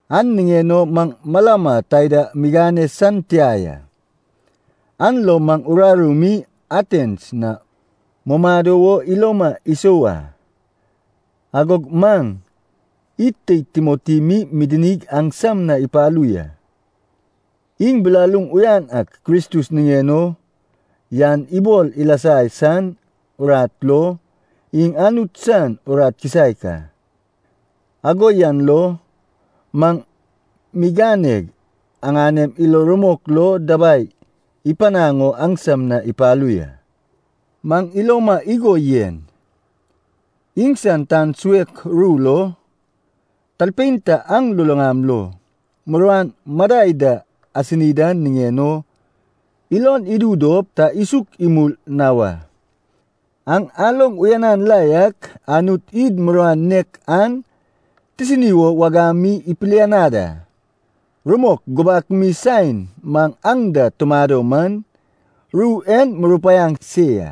An niŋen o maŋ malama taida migane san tia ya. An lo maŋ uraru mi Atens na mumado wo iloma isou a. Agog maŋ id teid Timoti mi midinig aŋsam na ipalu ya. Iŋ bilaluŋ uyan ak Kristus niŋen o yan ibol ilasa san urat lo, iŋ Anut san urat kisaek a. Ago yan lo maŋ miganeg, aŋanem ilo rumok lo dabai ipanaŋ o aŋsam na ipalu ya. Maŋ iloma igo yen, iŋsan tan suek ru lo, talpein ta aŋ luluŋam lo muruan madai da asini dan niŋen o ilon idu dop ta isuk imul na wa. Aŋ aloŋ uyanan la yak, Anut id muruan nek an tisini wo wagam mi ipilianad a. Rumok gubak mi saen maŋ aŋ da tumado man, ru en murupaiaŋ se ya,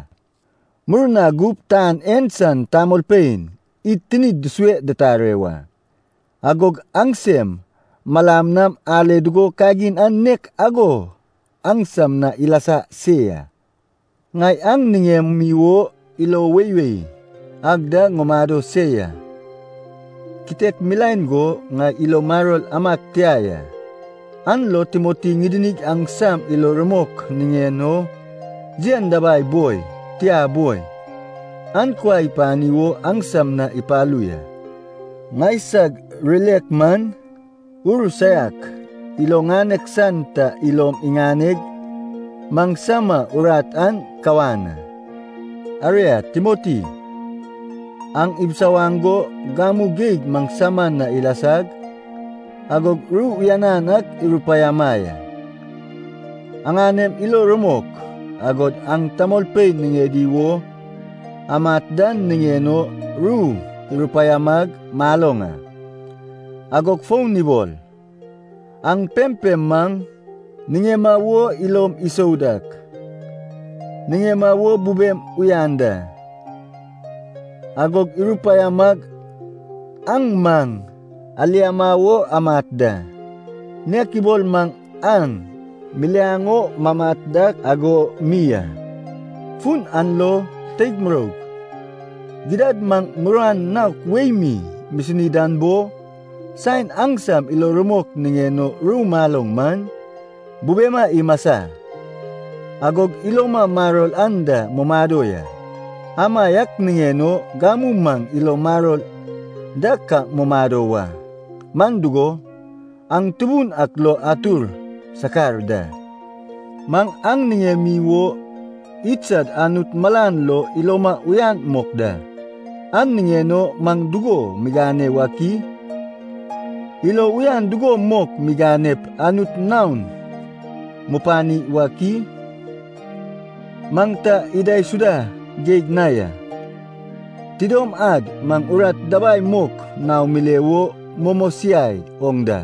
murna gup tan en san tamolpein id tinid dusue dutare wa. Agog aŋsem malam nam ale dugo kagin an nek ago aŋsam na ilasa se ya. Ŋai aŋ niŋemi wo ilo weiwei ag da ŋumado se ya. Kitek milaen go ŋai ilo maror amag tia ya, an lo Timoti ŋidinig aŋsam ilo rumok niŋen o yen dabai boi, tia boi, an kuai ipani wo aŋsam na ipalu ya. Ŋaisag rirek man, ur saiak ilo ŋanek san ta ilom iŋaneg maŋsama urat an kawan a. Aria Timoti, aŋ ibisawaŋ go gamu geig maŋsama na ilasag, agog ru uyanan ak irupaiama ya. Aŋanem ilom rumok, agod aŋ tamolpein niŋedi wo amat dan niŋen o ru irupaiamag maloŋ a. Agog fon ibol, aŋ pempem maŋ niŋema wo ilom isou dak, niŋema wo bubem uyan da. Agog irupaiamag aŋ maŋ aliama wo amat da, nek ibol maŋ aŋ miliaŋ o mamat dak ago mi a. Fun an lo, teig muroug, gidad maŋ muruan naok wei mi misini dan bo, saen aŋsam ilo rumok niŋen o ru maloŋ man, bubema imasa, agog iloma maror anda mumado ya. Amaiak niŋen o gamu maŋ ilo maror da ka mumado wa, man dugo, aŋ Tubun ak lo atur sakar da. Maŋ aŋ niŋemi wo idsad Anut malan lo iloma uyan mok da. An niŋen o maŋ dugo migane wak i? Ilo uyan dugo mok miganep Anut naon mupani wak i? Maŋ ta idaisuda geig na ya. Tidom ad maŋ urat dabai mok naom mile wo mumosiai oŋ da.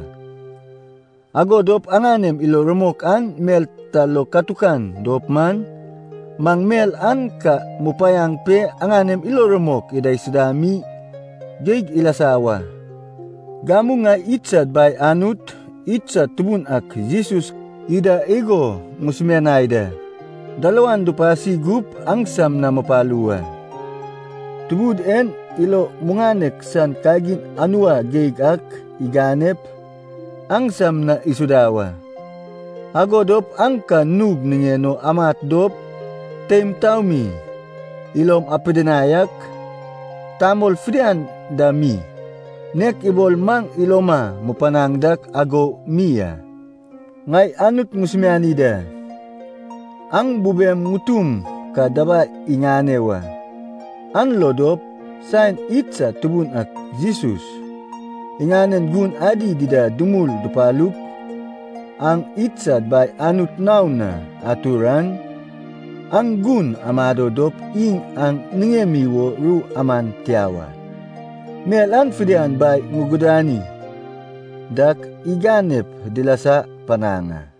Ago dop aŋanem ilo rumok an mel ta lo katukan dop man, maŋ mel an ka mupanaŋ pe aŋanem ilo rumok idaisuda mi geig ilasa wa. Gamu ŋai idsad Bai Anut, idsad Tubun ak Jesus ida igo ŋusumianai da, dalawan dupasi gup aŋsam na mupalu wa. Tubud en ilo muŋanek san kagin anua geig ak iganep, aŋsam na isuda wa. Ago dop aŋ ka nug niŋen o amat dop teim taomi ilom apidinai ak, tamol fidian dam mi, nek ibol maŋ iloma mupanaŋ dak ago mi a. Ŋai Anut ŋusumiani da, aŋ bubem ŋutum ka dabai iŋane wa. An lo dop, saen idsad Tubun ak Jesus, iŋanen gun adi dida dumul dupalup, aŋ idsad Bai Anut naon na atur an, aŋ gun amado dop iŋ aŋ niŋemi wo ru aman tia wa. Mel an fidian Bai ŋugudani dak iganep dilasa panaŋ a.